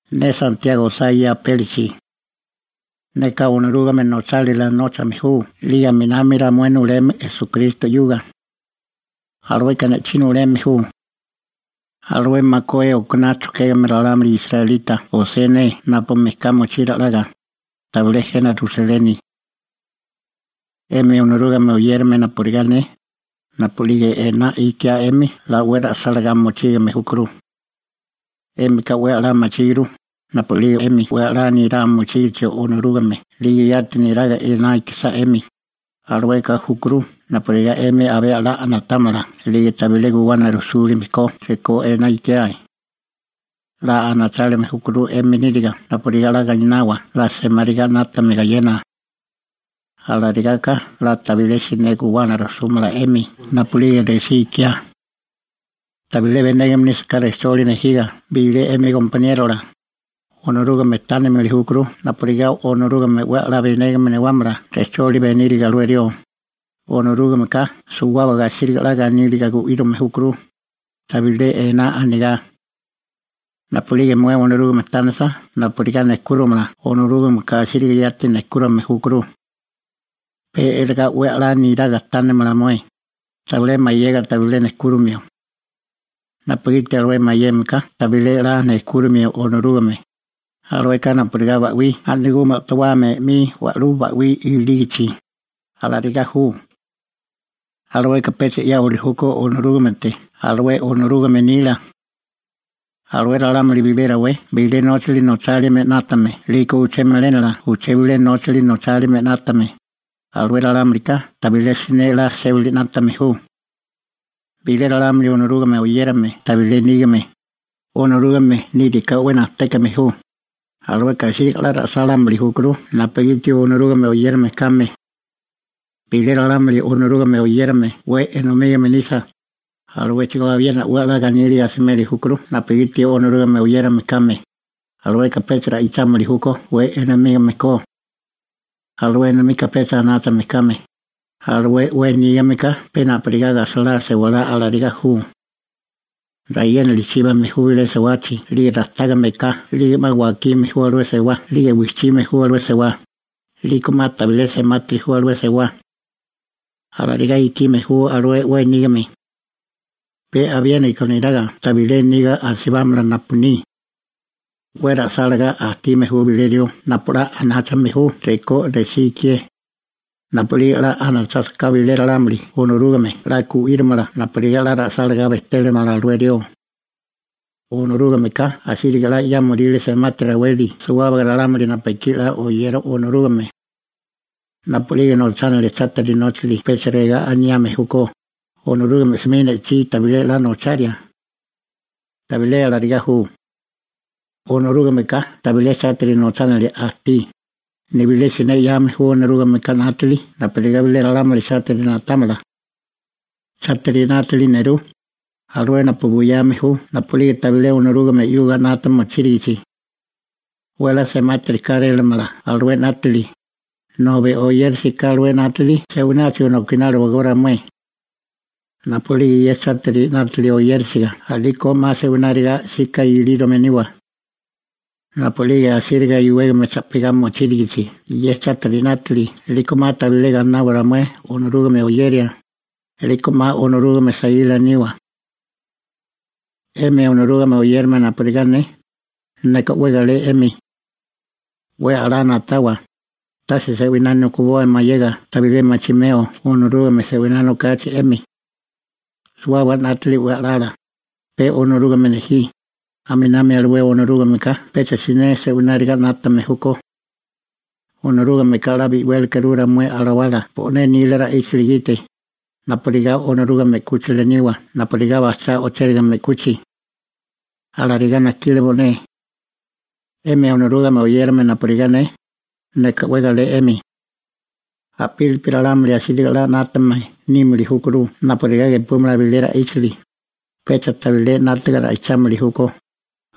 Ne Santiago osá ye apélichi. Neka Onorúgame nochálila nóchame ju 'lige aminami ramué nuleme Esukristo 'yuga. Alueka ne'chí nuleme ju. Alué makué okaná chojkégame ralámuli israelita osé ne napu mejká mochí ra'laga, tabilé jena Rusaleni. 'Emi Onorúgame oyérame napurigá ne, napu'lige ená ikiá 'emi 'la 'we ra'sálagá mochílime júkuru. 'Émika 'we 'la machíguru, napu'lige 'emi 'we 'la nirá mochígachi Onorúgame 'lige yati neraga ená ikisá 'emi, alueka júkuru napurigá 'emi abé a'lá na'támala 'lige tabilé guwana rujsúlime ko rekó ená ikiae. 'La anachálime júkuru 'emi níriga napurigá 'la gainawa 'la semáriga 'nátame gayena. Alarigaka 'la tabilé siné guwana rujsúmala 'emi napu'lige resí ikiá. Tabilé benégame nísaká rejcholi nejiga bilé 'emi gompaniérola, Onorúgame tánilimili júkuru napurigá Onorúgame 'we 'la benégame newámala rejcholi beníriga alué rió, Onorúgameka suwábaga asíriga 'la ganíliga gu'írame júkuru, tabilé ená anigá. Napu'lige mué Onorúgame tánisa napurigá nejkúramala Onorúgameka asíriga yati nejkúrame júkuru. Pe iligá 'we 'la niraga tánimala mué, tabilé mayega tabilé nejkúromio, napugiti alué mayeme ka tabilé 'la nejkúromio Onorúgame, alueka napurigá ba'wí a'nagumi o'towame 'mi wa'lú ba'wí ilígichi, alarigá ju. Alueka pecha 'yáwili júkó Onorúgamete alué Onorúgame nila. Alué ralámuli bilé rawé bilé nóchali nochálime 'nátame 'lige uché melénala uché bilé nóchali nochálime 'nátame, alué ralámulika tabilé siné 'la sébali 'nátame ju. Bilé ralámuli Onorúgame oyérame tabilé nígame, Onorúgame níriká 'we najtékame ju, alueka asíriga 'la ra'sálámili júkuru napugiti Onorúgame oyérame kame. Bilé ralámuli Onorúgame oyérame 'we enomígame nisa, aluéchigó abiena 'we 'la ganíliga asimeli júkuru napugiti Onorúgame oyérame kame, alueka pecha ra'ichámili júkó 'we enomígame ko. Alué enomika pecha anáchame kame, alué 'we nígame ka pe napurigá gajsalá sewalá alarigá ju. Rayénali chíbame ju bilé sewachi 'lige rajtágame eká 'lige 'ma wakiame ju alué sewá 'lige wijchime ju alué sewá, 'liko 'ma tabilé semátiri ju alué sewá. Alarigá ikime ju alué 'we nígame. Pe abiéniko neraga tabilé niga asibámala napu ni. 'We ra'sálagá ajtíame ju bilé rió napu 'la anáchame ju rekó resí ikié. Napu'lige 'la anachásaká bilé ralámuli Onorúgame 'la gu'írimala napurigá 'la ra'sálagá bejtélamala alué rió. Onorúgameka asíriga 'la 'yámoríle semati raweli suwábaga ralámuli napu ekí 'la oyeri Onorúgame. Napu'lige nochánilia chátiri nóchali pecha regá aniame júkó: «Onorúgame 'smi ne'chí tabilé 'la nocharia.» Tabilé alarigá ju. Onorúgameka tabilé chátiri nochánilia ajtí, nibilé siné 'yame ju Onorúgameka 'nátili napurigá bilé ralámuli chátiri na'támala. Chátiri 'nátili nerú, alué napu buyame ju napu'lige tabilé Onorúgame 'yuga 'nata mochírigichi. 'We 'la semátiri kárélamala alué 'nátili, nobi oyérisiká alué 'nátili se'wináchigo nokináliwagó ramué. Napu'lige ye chátiri 'nátili oyérisiga a'lígeko 'ma se'wináriga 'sika ilírome niwa. Napu'lige asíriga iwégame cha'pigá mochírigichi ye chátiri 'nátili 'liko 'ma tabilé gainawa ramué Onorúgame oyeria, 'liko 'ma Onorúgame saíla niwa. 'Emi Onorúgame oyérame napurigá ne, neka 'we galé 'emi. 'We 'la na'tawa, tase se'winá nokiboa mayega tabilé machimeo Onorúgame se'winá nokachi 'emi. Suwábaga 'nátili 'we a'lala, pe Onorúgame nejí, aminami alué Onorúgameka pecha siné se'wináriga 'nátame júkó. Onorúgameka 'la bi'wélekuru ramué alawala bo'né nila ra'íchali gite, napurigá Onorúgame 'kúchila niwa napurigá bajchá o'chérigame 'kuchi. Alarigá najkile bo'né. 'Emi Onorúgame oyérame napurigá ne, neka 'we galé 'emi. A'pílipi ralámuli asíriga 'la 'nátame nímili júkuru napurigá gepúmala bilé ra'íchali, pecha tabilé 'nátiga ra'ichámili júkó,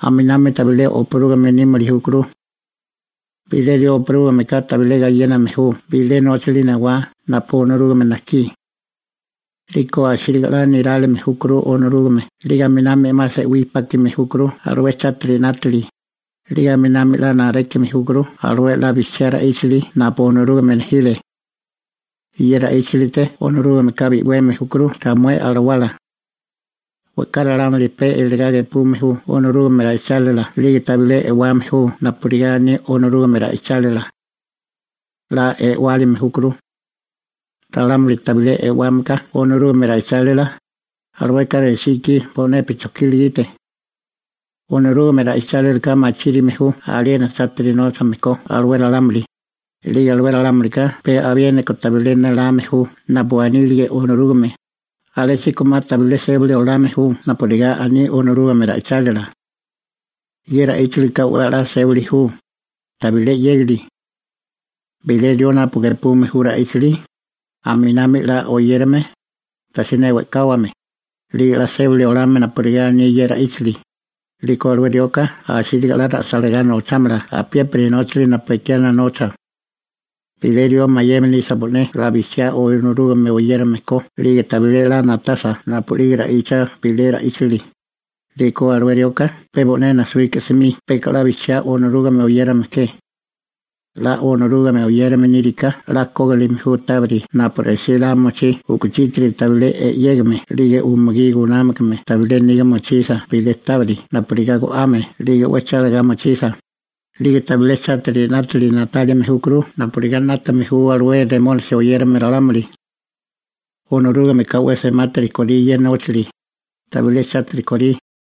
aminami tabilé oparúgame nímili júkuru. Bilé rió opurúgameka tabilé gayéname ju bilé nóchali newá napu Onorúgame najkí. 'Liko asíriga 'la nirálime júkuru Onorúgame 'lige aminami 'ma se'wí pákime júkuru alué chátiri 'nátili, 'lige aminami 'la narékime júkuru alué 'la bijchiá ra'íchali napu Onorúgame nejile. Ye ra'íchalite Onorúgameka bi'weme júkuru ramué alawala. We'ká ralámuli pe eligá gepume ju Onorúgame nila ra'íchali 'lige tabilé e'wame ju napurigá aní Onorúgame ra'ichálila. 'La e'wilime júkuru. Ralámuli tabilé e'wámeka Onorúgame nila ra'íchali, alueka resí ikí bo'nepi chojkila gite. Onorúgame ra'ichálilaka machírime ju aliena chátiri nóchame ko alué ralámuli, 'lige alué ralámulika pe abiéniko tabilé néláme ju napu anílige Onorúgame, alésíko 'ma tabilé sébali olame ju napurigá aní Onorúgame ra'ichálila. Ye ra'íchalika 'we 'la sébali ju, tabilé 'yégali. Bilé rió napu gepume ye ra'íchali, aminabi 'la oyérame, tajsiné we'káwame, 'lige 'la sébali olame napurigá aní ye ra'íchali, 'liko alué rioka asíriga 'la ra'sálagá nochámala apiépiri nóchali napu ekiana nocha. Bilé rió mayeme nisa bo'né 'la bijchiá Onorúgame oyérame ko 'lige tabilé 'la na'tasa napu'lige ra'icha bilé ra'íchali, 'liko alué rioka pe bo'né najsuíka 'smi peka 'la bijchiá Onorúgame oyérame ke. 'La Onorúgame oyérame níriká 'la kógilime ju tábiri napu resí la mochí u'kuchítiri tabilé e'yégame 'lige umugí gunámakame tabilé niga mochisa bilé tábiri napurigá go'ame 'lige 'we chálagá mochisa, 'lige tabilé chátiri 'nátili na'tálime júkuru napurigá 'nátame ju alué Riablo (Remónisi) oyérame ralámuli. Onorúgameka 'we semátiri korí ye nóchali, tabilé chátiri korí.